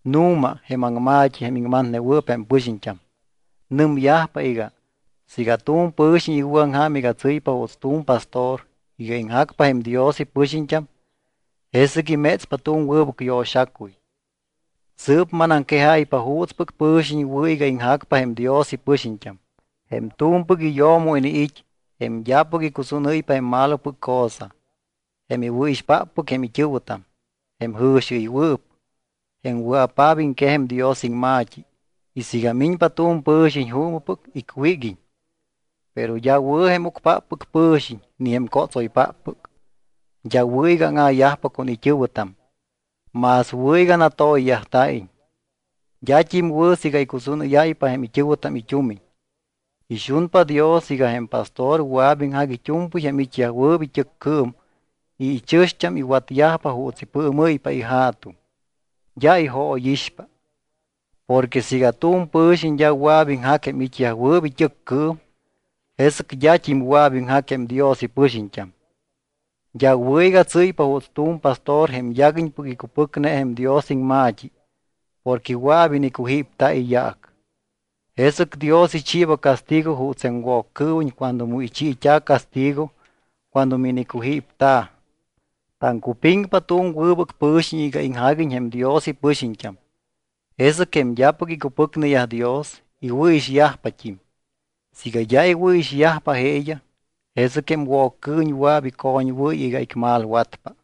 Nu̱ma jém aŋma̱t́i jém iŋmatnewɨɨp jém pɨxiñt́am. Nɨmyajpa iga, Siiga tu̱m pɨ̱xiñ iwɨ̱aŋja̱m iga tsɨ́ypa juuts tu̱m pastor iga iŋjacpa jém Dios ipɨxiñt́am, jesɨc imétspa tu̱m wɨbɨc yo̱xacuy. Sɨɨp manaŋquejáypa juutspɨc pɨ̱xiñ wɨ̱ iga iŋjacpa jém Dios ipɨxiñt́am: jém tu̱mpɨc iyo̱mo iniit́, jém d́apɨc icusúnɨ́ypa jém malopɨc cosa, jém iwɨ̱ixpáppɨc jém it́ɨ̱wɨtam, jém jɨ̱xiɨywɨɨp, jém wɨa̱paap iŋquej jém Dios iŋma̱t́i, y siiga miñpa tu̱m pɨ̱xiñ juumɨpɨc, icwíguiñ. Pero d́a wɨ̱ jém ucpáppɨc pɨ̱xiñ ni jém cótsoypáppɨc. D́a wɨ̱ iga áŋa̱yajpa con it́ɨ̱wɨtam. Más wɨ̱ iga natoyyajta̱iñ. D́at́im wɨ̱ siiga icusúnɨ́yáypa jém it́ɨ̱wɨtam it́umiñ. Ixunpa Dios iga jém pastor wɨa̱p iŋjac it́u̱mpɨy jém it́yajwɨɨp it́ɨccɨɨm y jém ichɨ̱xt́am iwatpa juuts ipɨɨmɨ́ypa ija̱tuŋ. D́a ijóyixpa. Porque siiga tu̱m pɨ̱xiñ d́a wɨa̱p iŋjac jém it́yajwɨɨp it́ɨccɨɨm, jesɨc d́at́im wɨa̱p iŋjac jém Dios ipɨxiñt́am. D́a wɨ̱ iga tsɨ́ypa juuts tu̱m pastor jém yaguiñpɨc icupɨcne jém Dios iŋma̱t́i porque wɨa̱p inicujípta̱ iyaac. Jesɨc Dios ichiiba castigo juuts jém Woccɨɨwiñ cuando mu ichiit́a̱ castigo cuando minicujípta̱. Taŋcupiŋpa tu̱m wɨbɨc pɨ̱xiñ iga iŋjaguiñ jém Dios ipɨxiñt́am, jesɨc jém d́apɨc icupɨcneyaj Dios, iwɨ̱ixyajpat́im. Siiga d́a iwɨ̱ixyajpa jeeyaj, jesɨc jém Woccɨɨwiñ wɨa̱p icoñwɨ́y iga icmalwatpa.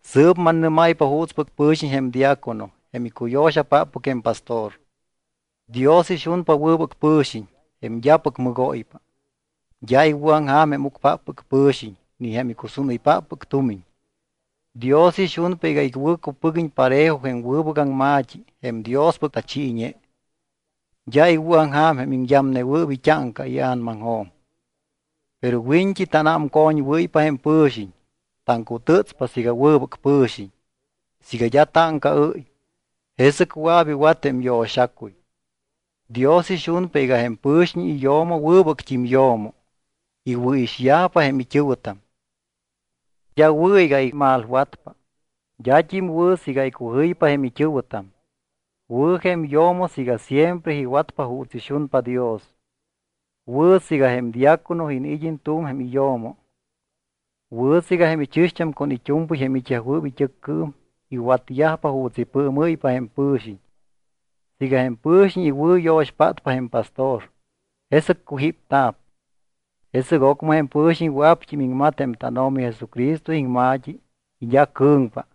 Sɨɨp mannɨ́máypa juutspɨc pɨ̱xiñ jém diácono, jém icuyo̱xapáppɨc jém pastor. Dios ixunpa wɨbɨc pɨ̱xiñ, jém d́apɨc mɨgóypa. D́a iwɨ̱aŋja̱m jém ucpáppɨc pɨ̱xiñ ni jém icusúnɨypáppɨc tumiñ. Dios ixunpa iga iwɨ̱cupɨguiñ parejo jém wɨbɨc aŋma̱t́i jém Diospɨc tachiiñe. D́a iwɨ̱aŋja̱m jém iŋyamnewɨɨp it́áŋca ia̱namaŋjo̱m. Pero wiñt́i tanámcoñwɨ́ypa jém pɨ̱xiñ, taŋcutɨtspa siiga wɨbɨc pɨ̱xiñ. Siiga d́a táŋcaɨ́y, jesɨc wɨa̱p iwat jém yo̱xacuy. Dios ixunpa iga jém pɨ̱xiñ iyo̱mo wɨbɨct́im yo̱mo. Iwɨ̱ixyajpa jém it́ɨ̱wɨtam. D́a wɨ̱ iga imalwatpa. D́at́im wɨ̱ siiga icujɨypa jém it́ɨ̱wɨtam. Wɨ̱ jém yo̱mo siiga siempre iwatpa juuts ixunpa Dios. Wɨ̱ siiga jém diácono iniid́iñ tu̱m jém iyo̱mo. Wɨ̱ siiga jém ichɨ̱xt́am con it́u̱mpɨy jém it́yajwɨɨp it́ɨccɨɨm iwatyajpa juuts ipɨɨmɨ́ypa jém pɨ̱xiñ. Siiga jém pɨ̱xiñ iwɨ̱yo̱xpátpa jém pastor, jesɨc cujípta̱p. Jesɨc ocmɨ jém pɨ̱xiñ wɨa̱pt́im iŋmat jém tánO̱mi Jesucristo iŋma̱t́i y d́a cɨ̱ŋpa.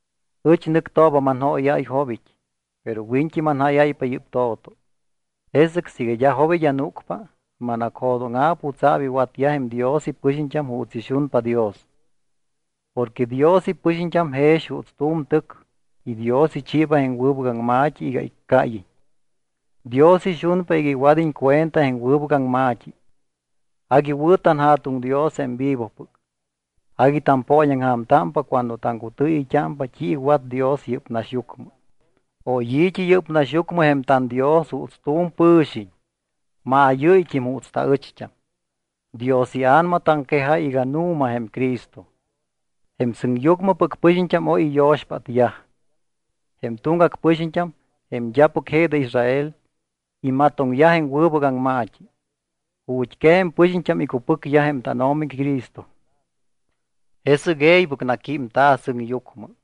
Ɨch nɨctooba manjóyáy jobit́, pero wiñt́i manjáyáypa yɨ́p to̱to. Jesɨc siiga d́a jobit́ anúcpa, manacjo̱dóŋa̱p jutsa̱p iwatyaj jém Dios ipɨxiñt́am juuts ixunpa Dios. Porque Dios ipɨxiñt́am jex juuts tu̱m tɨc y Dios ichiiba jém wɨbɨc aŋma̱t́i iga iccáyiñ. Dios ixunpa iga iwad́iñ cuenta jém wɨbɨc aŋma̱t́i. Agui wɨ̱ tanJa̱tuŋ Dios jém vivopɨc. Agui tampooñaŋja̱mtámpa cuando taŋcutɨɨyɨyt́ámpa t́i iwat Dios yɨ́p naxyucmɨ: Oy i̱t́i yɨ́p naxyucmɨ jém tanDios juuts tu̱m pɨ̱xiñ, maayɨ́yt́im juuts taɨcht́am. Dios iA̱nama taŋquejáy iga nu̱ma jém Cristo. Jém sɨŋyucmɨpɨc pɨxiñt́am oy iyo̱xpátyaj. Jém tuŋgac pɨxiñt́am, jém d́apɨc je de Israel, imatoŋyaj jém wɨbɨc aŋma̱t́i. Ju̱t́quej jém pɨxiñt́am icupɨcyaj jém tánO̱mi Cristo. Jesɨc e̱ybɨc naquímta̱ sɨŋyucmɨ.